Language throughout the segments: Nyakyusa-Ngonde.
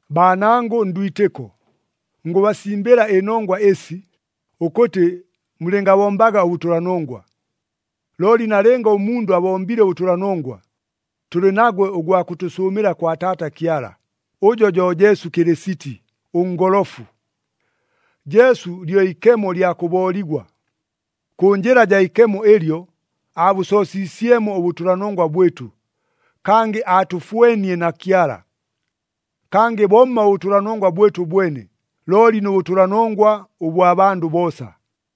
Baanangʉ ndwitɨko, ngʉbasimbɨla ɨnongwa ɨsi, ʉkʉtɨ mulɨngabombaga ʉbʉtʉlanongwa. Looli nalɨnga ʉmundʉ abombile ʉbʉtʉlanongwa, tʉlɨ nagwe ʉgwa kʉtʉsʉʉmɨla kwa Taata Kyala, ʉjo jo Jesu Kɨlɨsiti, ʉNgolofu. Jesu lyo ikemo lya kʉbooligwa. Kʉ njɨla jaa ikemo ɨlyo, aabʉsoosiisyemo ʉbʉtʉlanongwa bwɨtʉ, kangɨ aatʉfwenie na Kyala. Kangɨ bomma ʉbʉtʉlanongwa bwɨtʉ bwene, looli nʉ bʉtʉlanongwa ʉbwa bandʉ boosa.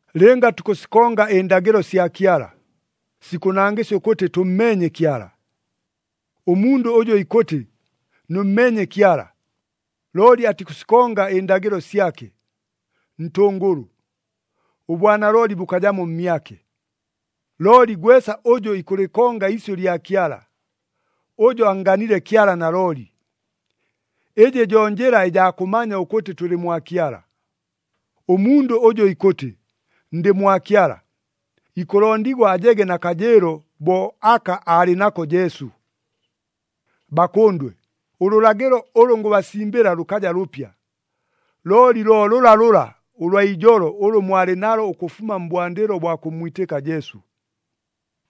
Lɨnga tukʉsikonga ɨndagɨlo sya Kyala, sikʉnangɨsya ʉkʉtɨ tʉmmeenye Kyala. Ʉmundʉ ʉjʉ ikʉtɨ, “Nʉmmeenye Kyala,” looli atikʉsikonga ɨndagɨlo syake, ntʉngʉlʉ, ʉbwanalooli bʉkajamo mmyake. Looli gwesa ʉjʉ ikʉlɨkonga iisyʉ lya Kyala, ʉjo annganile Kyala nalooli. Ɨjɨ jo njɨla ɨjaa kʉmanya ʉkʉtɨ tʉlɨ mwa Kyala. Ʉmundʉ ʉjʉ ikʉtɨ, “Ndɨ mwa Kyala,” ikʉlondigwa ajege na kajɨɨlo bo aka aalɨ nako Jesu. Bakʉndwe, ʉlʉlagɨlo ʉlʉ ngʉbasimbɨla lʉkaja lʉpya, looli lo lʉlalʉla ʉlwa ijolo ʉlʉ mwalɨ nalo ʉkʉfuma mbwandɨlo bwa kʉmmwitɨka Jesu.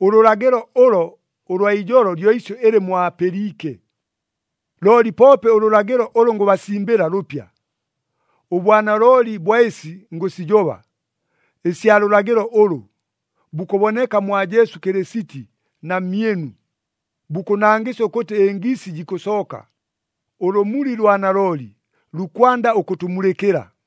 Ʉlʉlagɨlo ʉlo ʉlwa ijolo lyo isyʉ ɨlɨ mwapɨliike. Looli poope ʉlʉlagɨlo ʉlʉ ngʉbasimbɨla lʉpya. Ʉbwanalooli bwa ɨsi ngʉsijoba, ɨsya lʉlagɨlo ʉlʉ, bukʉboneka mwa Jesu Kɨlɨsiti na mmyɨnu, bukʉnangɨsya ʉkʉtɨ ɨngiisi jikʉsooka, ʉlʉmuli lwa nalooli lukwanda ʉkʉtʉmulɨkɨla.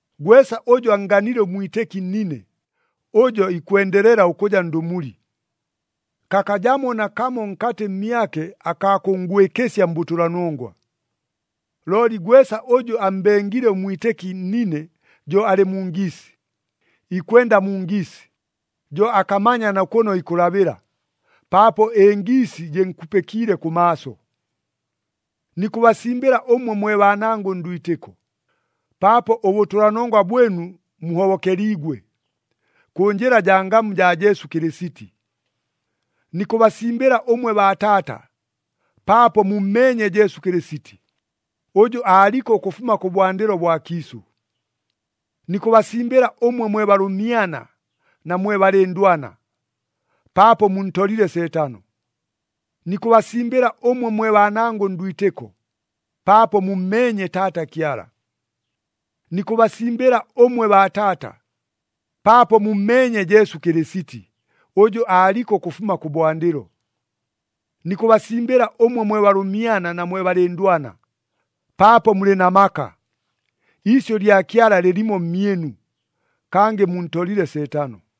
Gwesa ʉjʉ annganile ʉmwitɨki nnine, ʉjo ikwendelela ʉkʉja ndʉmuli. Kakajamo nakamo nkatɨ mmyake akaa kʉnngwɨkɨsya mbʉtʉlanongwa. Looli gwesa ʉjʉ ammbengile ʉmwitɨki nnine jo alɨ mu ngiisi, ikwenda mu ngiisi, jo akamanya na kʉno ikʉlabɨla, paapo ɨngiisi jɨnkupɨkiile kʉmaaso. Nikʉbasimbɨla ʉmwe mwe baanangʉ ndwitɨko, paapo ʉbʉtʉlanongwa bwɨnu muhobokeliigwe, kʉ njɨla jaa ngamu jaa Jesu Kɨlɨsiti. Nikʉbasimbɨla ʉmwe baataata, paapo mummeenye Jesu Kɨlɨsiti, ʉjʉ aaliko ʉkʉfuma kʉbwandɨlo bwa kiisʉ. Nikʉbasimbɨla ʉmwe mwe balʉmyana na mwe balɨndwana, paapo muntolile Seetano. Nikʉbasimbɨla ʉmwe mwe baanangʉ ndwitɨko, paapo mummeenye Taata Kyala. Nikʉbasimbɨla ʉmwe baataata, paapo mummeenye Jesu Kɨlɨsiti, ʉjʉ aaliko ʉkʉfuma kʉbwandɨlo. Nikʉbasimbɨla ʉmwe mwe balʉmyana na mwe balɨndwana, paapo mulɨ na maka, iisyʉ lya Kyala lɨlimo mmyɨnu, kangɨ muntolile Seetano.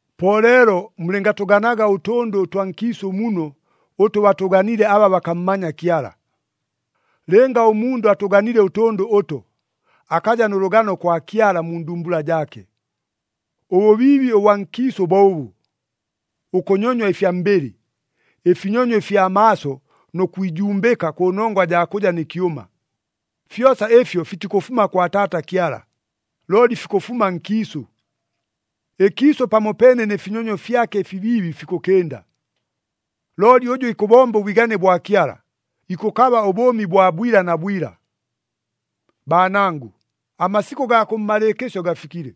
Po leelo mulɨngatʉganaga ʉtʉndʉ ʉtwa nkiisʉ muno ʉtʉ batʉganile aba bakammanya Kyala. Lɨnga ʉmundʉ atʉganile ʉtʉndʉ ʉto, akaja nʉ lʉgano kwa Kyala mu ndumbula jaake. Ʉbʉbiibi ʉbwa nkiisʉ bo ʉbʉ. Ʉkʉnyonywa ɨfya mbɨlɨ, ɨfinyonyo ɨfya maaso nʉ kwijumbɨka kʉnongwa jaa kʉja nɨ kyʉma. Fyosa ɨfyo fitikʉfuma kwa Taata Kyala, looli fikʉfuma nkiisʉ. Ɨkiisʉ pamopeene nɨ finyonyo fyake ɨfibiibi fikʉkɨnda. Looli ʉjʉ ikʉbomba ʉbwigane bwa Kyala, ikʉkaba ʉbʉʉmi bwa bwila na bwila. Baanangʉ, amasikʉ gaa kʉmmalɨɨkɨsyo gafikile!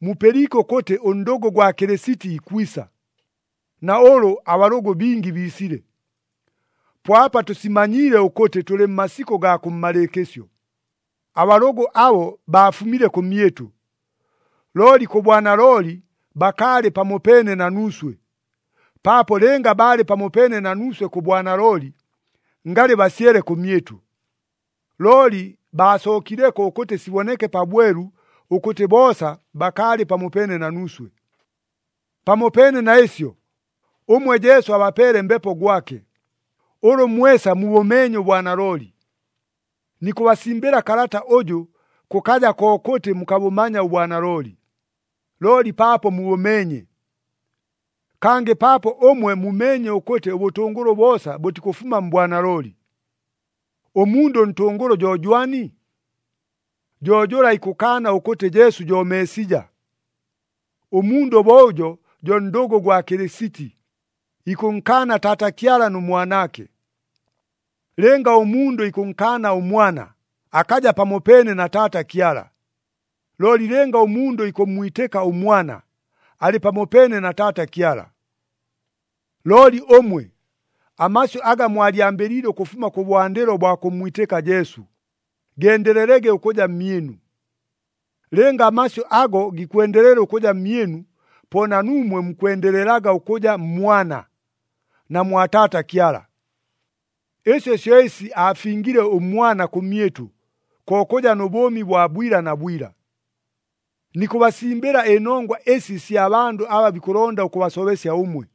Mupɨliike ʉkʉtɨ ʉndʉgʉ gwa Kɨlɨsiti ikwisa, na ʉlʉ abalʉgʉ bingi biisile. Po apa tʉsimanyiile ʉkʉtɨ tʉlɨ mmasikʉ gaa kʉmmalɨɨkɨsyo. Abalʉgʉ abo baafumile kʉmyɨtʉ, looli kʉ bwanalooli bakaalɨ pamopeene na nuuswe, paapo lɨnga baalɨ pamopeene na nuuswe kʉ bwanalooli, ngalɨ basyele kʉmyɨtʉ. Looli baasookileko ʉkʉtɨ siboneke pabwelu ʉkʉtɨ boosa bakaalɨ pamopeene na nuuswe. Pamopeene na ɨsyo, ʉmwe Jesu abapeele Mbepo gwake, ʉlʉ mwesa mubʉmeenye ʉbwanalooli. Nikʉbasimbɨla kalata ʉjʉ, kʉkaja kokʉtɨ mukabʉmanya ʉbwanalooli, looli paapo mubʉmeenye. Kangɨ paapo ʉmwe mumeenye ʉkʉtɨ ʉbʉtʉngʉlʉ boosa bʉtikʉfuma mbwanalooli. Ʉmundʉ ʉntʉngʉlʉ jo jwani? Jo jʉla ikʉkaana ʉkʉtɨ Jesu jo Meesija. Ʉmundʉ bo ʉjo jo ndʉgʉ gwa Kɨlɨsiti, ikʉnkaana Taata Kyala nʉ Mwanaake. Lɨnga ʉmundʉ ikʉnkaana ʉMwana, akaja pamopeene na Taata Kyala. Looli lɨnga ʉmundʉ ikʉmmwitɨka ʉMwana, alɨ pamopeene na Taata Kyala. Looli ʉmwe, amasyʉ aga mwalyambɨliile ʉkʉfuma kʉbwandɨlo bwa kʉmmwitɨka Jesu, gendelelege ʉkʉja mmyɨnu. Lɨnga amasyʉ ago gikwendelela ʉkʉja mmyɨnu, po na nuumwe mukwendelelaga ʉkʉja mMwana, na mwa Taata Kyala. Ɨsyo syo ɨsi aafingile ʉMwana kʉmyɨtʉ, ko kʉja nʉ bʉʉmi bwa bwila na bwila. Nikʉbasimbɨla ɨnongwa ɨsi ɨsya bandʉ aba bikʉlonda ʉkʉbasobesya ʉmwe.